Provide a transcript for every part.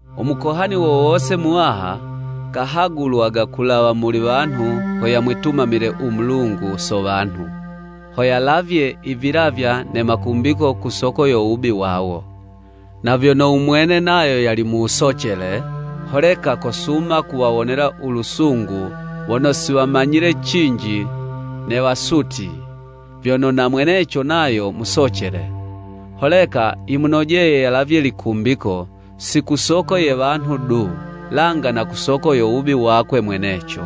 U Mukohani wo wose Muwaha, kahagulwaga kulawa muli wanhu ho yamwitumamile u Mulungu so wanhu, ho yalavye i vilavya ne makumbiko ku soko yo wubi wawo. Na vyono u mwene nayo yali mu wusocele, holeka kosuma kuwawonela u lusungu wono si wamanyile cinji ne wasutyi. Vyono na mweneco nayo musocele, holeka yimunojeye yalavye likumbiko, si ku soko ye wanhu du, langa na ku soko yo wubi wakwe mweneco.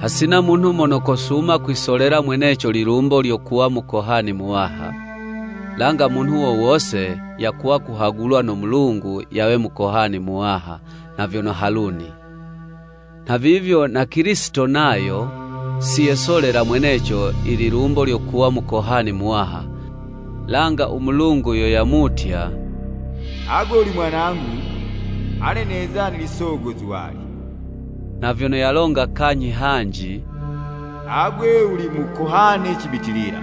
Hasina munhu mono kosuma kwisolela mweneco lilumbo lyo kuwa Mukohani Muwaha. Langa munhu wo wose yakuwa kuhagulwa no Mulungu yawe Mukohani Muwaha nha vyono Haluni. Nha vivyo na Kilisito nayo, si yesolela mweneco i lilumbo lyo kuwa Mukohani Muwaha, langa u Mulungu yo yamutya: “Agwe wuli Mwanangu ane neza nili Sogo zuwali.” Nha vyono yalonga kanyhi hanji: “Agwe wuli Mukohani cibitilila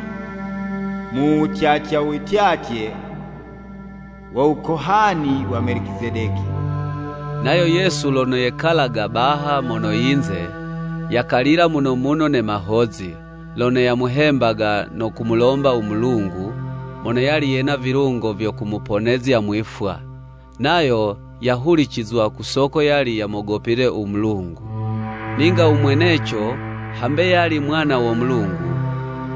mu wutyatya u wityatye wo wukohani wa Melicizedeki.” Nayo Yesu lono yekalaga baha mono yinze, yakalila muno muno ne mahozi, lono yamuhembaga no kumulomba u Mulungu, mono yali yena vilungo vyo kumuponezya mwifwa, nayo yahulicizwa ku soko yali yamogopile u Mulungu. Ninga u mweneco hambe yali Mwana wo Mulungu,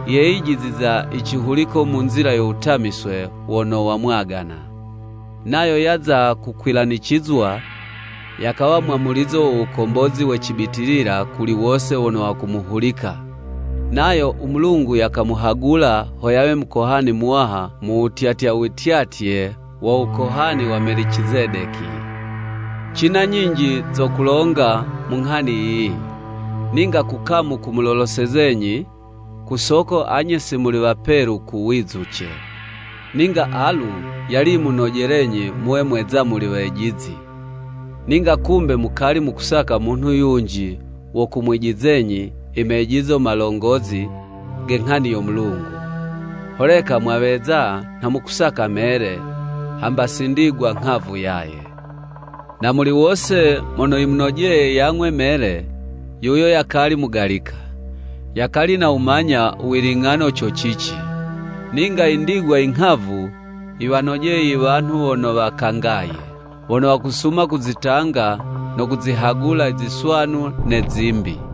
yeyijiziza i cihuliko mu nzila yo wutamiswe wono wamwagana. Nayo yaza kukwilanicizwa, yakawa wo mwamulizo wo wukombozi we cibitilila kuli wose wono wakumuhulika, nayo u Mulungu yakamuhagula ho yawe Mukohani Muwaha mu wutyatya u wityatye wo wukohani wa Melicizedeki. Cina nyinji zo kulonga mu nghani yiyi, ninga kukamu kumulolosezenyi, ku soko anye si muli wapelu ku wizuce. Ninga alu yali yimunojelenyi muwe mweza muli wejizi, ninga kumbe mukali mukusaka munhu yunji wo kumwijizenyi i mejizo malongozi ge nghani yo Mulungu, holeka mwaweza nha mukusaka mele, hamba si ndigwa nghavu yaye. Na muli wose mono yimunojeye yang'we mele, yuyo yakali mugalika, yakali nawumanya u wiling'ano co cici. Ninga i ndigwa i nghavu, yiwanojeye i wanhu wono wakangaye, wono wakusuma kuzitanga no kuzihagula i ziswanu ne zimbi.